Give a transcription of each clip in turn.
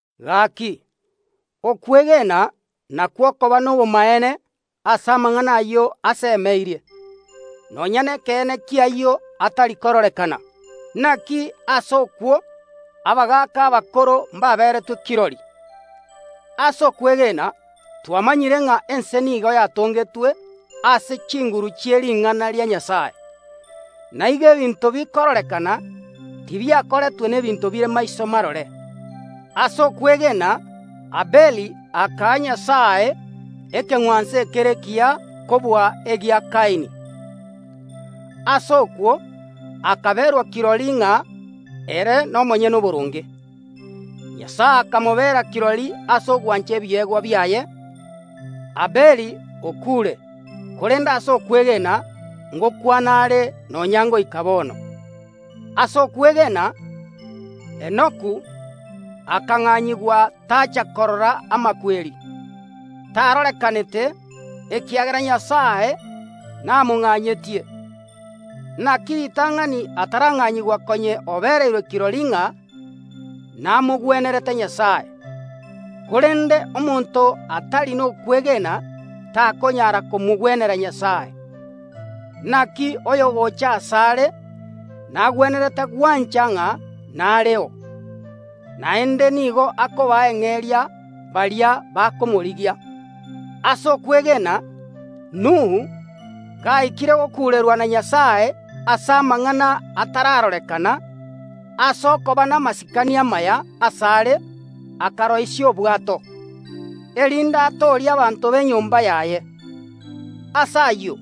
Gaki, okwegena nakwo okoba nobomaene ase amang’ana ayio asemeirie, nonya nekeene ki’ayio atari kororekana. Naki ase okwo abagaaka abakoro mbaberetwe kirori. Ase okwegena twamanyire ng’a ense nigo yatongetwe ase chinguru chi’ering’ana ria Nyasae, na igo ebinto bikororekana tibiakoretwe n’ebinto bire maiso marore. Ase okwegena Abeli akaa Nyasae ekeng’wanso ekere ekiya kobua egia Kaini. Ase okwo akaberwa kirori ng’a ere nomonyene oboronge. Nyasae akamobera kirori ase ogwancha ebiegwa biaye. Abeli okuure, korende ase okwegena ngokwana are nonya ngoika bono. Ase okwegena Enoku akang’anyigwa, tacha korora amakweri. Tarorekanete, ekiagera Nyasae namong’anyetie. Naki ritang’ani atarang’anyigwa konya obereirwe kirori ng’a namogwenerete Nyasae. Korende omonto atari nokwegena takonyara komogwenera Nyasae. Naki oyogocha asare nagwenerete gwancha ng’a nareo, naende nigo akobaa eng’eria baria bakomorigia. Ase okwegena Nuhu, gaikire g okuurerwa na Nyasae ase amang’ana atararorekana, ase okoba namasikani amaya asare akaroisia obwato, erinde atoorie abanto b’enyomba yaye. Ase ayio,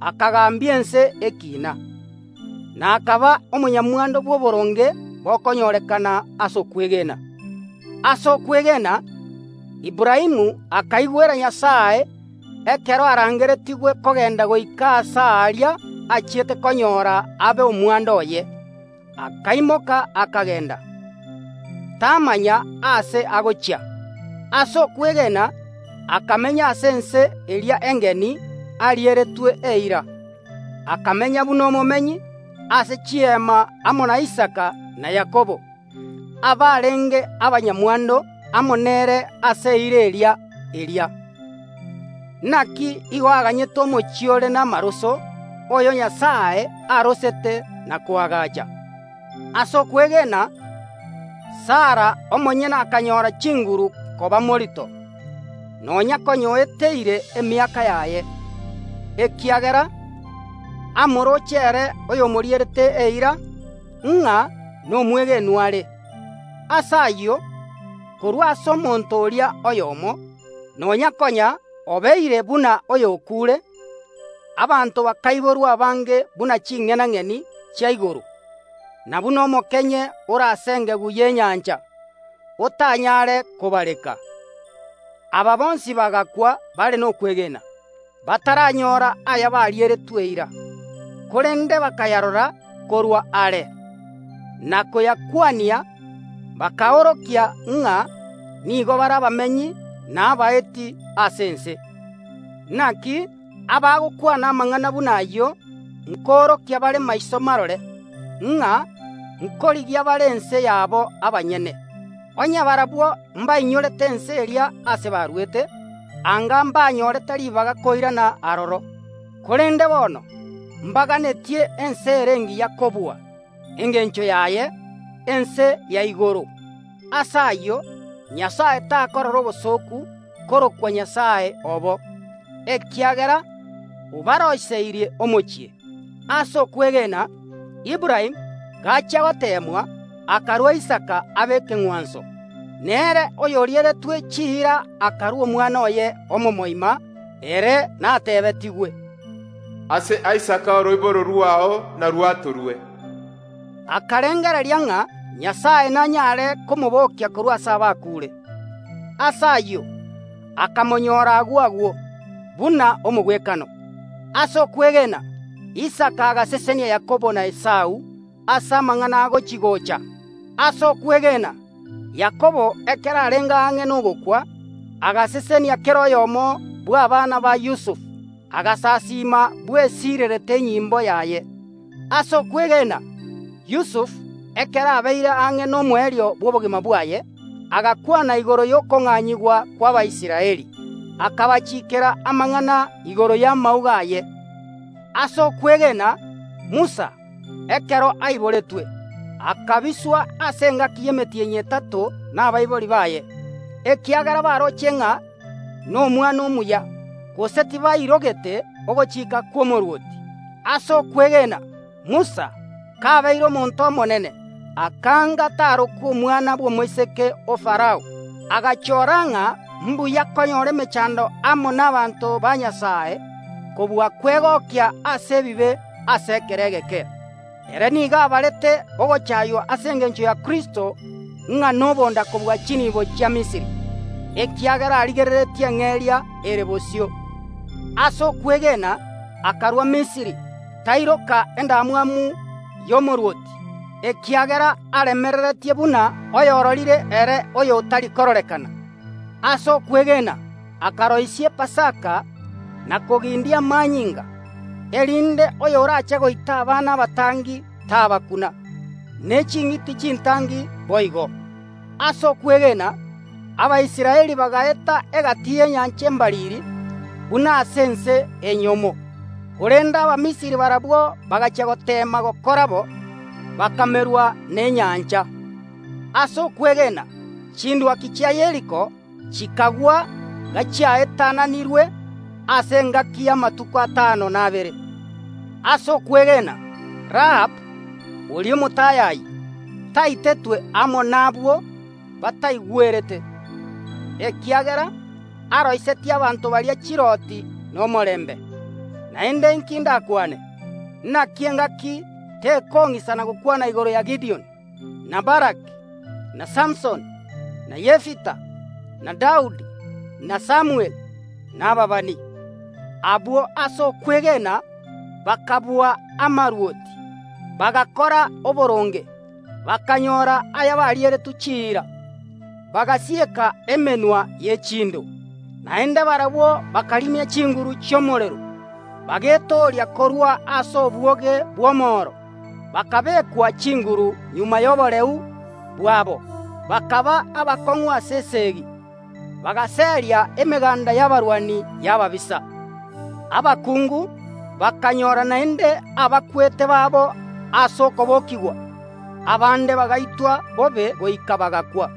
akagambia ense ekiina, na akaba omonyamwando bw’oboronge bokonyorekana ase okwegena. Ase okwegena Aburaamu akaigwera Nyasae ekero arangeretigwe kogenda goika aase aria achiete konyora abe omwando oye, akaimoka akagenda, tamanya aase agochia. Ase okwegena akamenya ase ense eria engeni arieretwe eira, akamenya buna omomenyi ase chiema amo na Isaka na Yakobo, abarenge abanyamwando amo nere ase eira eria eria. Naki igo aganyete omochie ore namaroso, oyo Nyasae aroseti na koagacha. Ase okwegena Sara omonyene akanyora chinguru koba morito, nonya konya oeteire emiaka yaye, ekiagera amorooche ere oyomorierete eira, ng’a nomwegenwa are. Ase ayio, korwa ase omonto oria oyomo, nonya konya obeire buna oyokuure, abanto bakaiborwa abange buna ching’enang’eni chia igoro, na buna omokenye ore ase engegu y’enyancha, otanyare kobareka. Aba bonsi bagakwa bare nokwegena, bataranyora ayabarieretwe eira, korende bakayarora korwa are, na koyakwania, bakaorokia ng’a nigo bare abamenyi na abaeti ase ense. Naki abagokwana amang’ana buna ayio nkoorokia bare maiso marore, ng’a nkorigia bare ense yabo abanyene. Onye barabwo mbainyorete ense eria ase baruete, anga mbanyorete ribaga koirana aroro. Korende bono mbaganetie ense ere engiya kobua, engencho yaye ense ya igoro. Ase ayio Nyasae takorora obosooku korokwa Nyasae obo, ekiagera obaroiseirie omochie. Ase okwegena Aburaamu, gachia goteemwa, akarua Isaka abe ekeng’wanso. Nere oyorieretwe chiira akarua omwana oye omomoima. Ere nateebetigwe, “Ase Isaka oroiboro rwao narwatorwe.” Akarengereria ng’a Nyasae nanyare komobokia korwa ase abakuure. Ase ayio akamonyora agwo agwo, buna omogwekano. Ase okwegena Isaka agasesenia Yakobo na Esau ase amang’ana agochi‐gocha. Ase okwegena Yakobo, ekero arenge ang’e nogokwa, agasesenia kera oyomo bw’abana ba Yusufu, agasasiima bwesiirerete enyimbo yaye. Ase okwegena Yusufu, ekero abeire ang’e nomoerio bw’obogima bwaye, agakwana igoro y’okong’anyigwa kw’Abaisraeli, akabachikera amang’ana igoro y’amauga aye. Ase okwegena Musa, ekero aiboretwe, akabiswa ase engaki y’emetienyi etato nabaibori baye, ekiagera baroche ng’a nomwana omuya, gose tibairogete ogochika kw’omorwoti. Ase okwegena Musa, kabeire omonto omonene, akaanga tarokwa omwana bw’omoiseke o Farao, agachoora ng’a mbuya konyora emechando amo nabaanto ba Nyasae kobua kwegokia ase ebibe ase ekero egeke. Ere nigo abarete ogochaaywa ase engencho ya Kristo ng’a nobonda kobua chiniibo chia Misiri, ekiagera arigereretie eng’eria ere bosio. Ase okwegena akarua Misiri, tairoka endamwamu y’omorwoti, ekiagera aremereretie buna oyororire ere oyotari kororekana. Ase okwegena akaroisia Epasaka na kogindia amanyinga, erinde oyoraache goita abana abatangi tabakuna, ne ching’iti chintangi boigo. Ase okwegena Abaisraeli bagaeta egati y’Enyancha Embariri buna ase ense enyomo. Korende Abamisiri barabwo bagachia goteema gokora bo, bakamerwa nenyancha. Ase okwegena chindwaki chia Yeriko chikagwa gachiaetananirwe ase engaki y’amatuko atano na abere. Ase okwegena Rahabu, oria omotayayi, taitetwe amo nabwo bataigwerete, ekiagera aroisetie abanto baria chirooti nomorembe. Naende inki ndakwane? Naki engaki tekong’isana gokwana igoro ya Gidioni, na Baraki, na Samusoni, na Yefita, na Daudi, na Samweli, na ababani. Abwo ase okwegena bakabua amarwoti, bagakora oboronge, bakanyoora ayabarieretwe chiira, bagasieka emenwa ye chindo. Naende barabwo bakarimia chinguru chi’omorero, bagetooria korwa ase obwoge bw’omoro, bakabeekwa chinguru magega y’oboreu bwabo, bakaba abakong’u ase esegi, bagaseria emeganda y’abarwani y’ababisa. Abakungu bakanyora naende abakwete babo ase okobokigwa. Abande bagaitwa bobe goika bagakwa,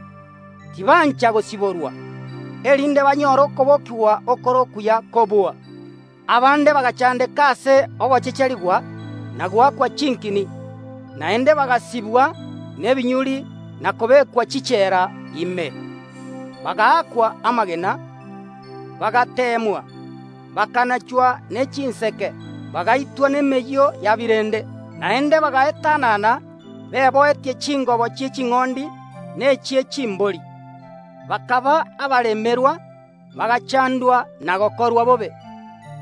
tibancha gosiborwa, erinde banyore okobokigwa okore okuya kobua. Abande bagachandeka ase ogochecherigwa na goakwa chinkini, naende bagasibwa nebinyuri na kobekwa chichela ime. Bagaakwa amagena, bagateemwa, bakanachwa ne chinseke, bagaitwa nemeyio ya birende. Naende bagaetanana beboetie chingobo chi’eching’ondi na echie chimbori, bakaba abaremerwa, bagachandwa na gokorwa bobe,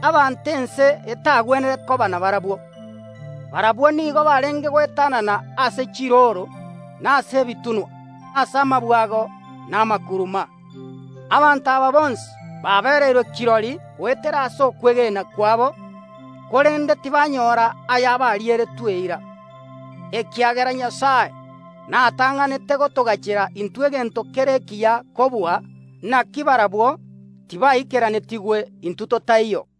abanto ense etagwenere koba nabarabwo. Barabwo nigo barenge goetanana ase chirooro na ase ebitunwa, ase amabwago na amakuruma. Abanto aba bonsi babereirwe kirori goetera ase okwegena kwabo, korende tibanyora ayabarieretwe eira, ekiagera Nyasae natang’anete gotogachera intwe egento kere ekiya kobua, naki barabwo tibaikeranetigwe intwe totaiyo.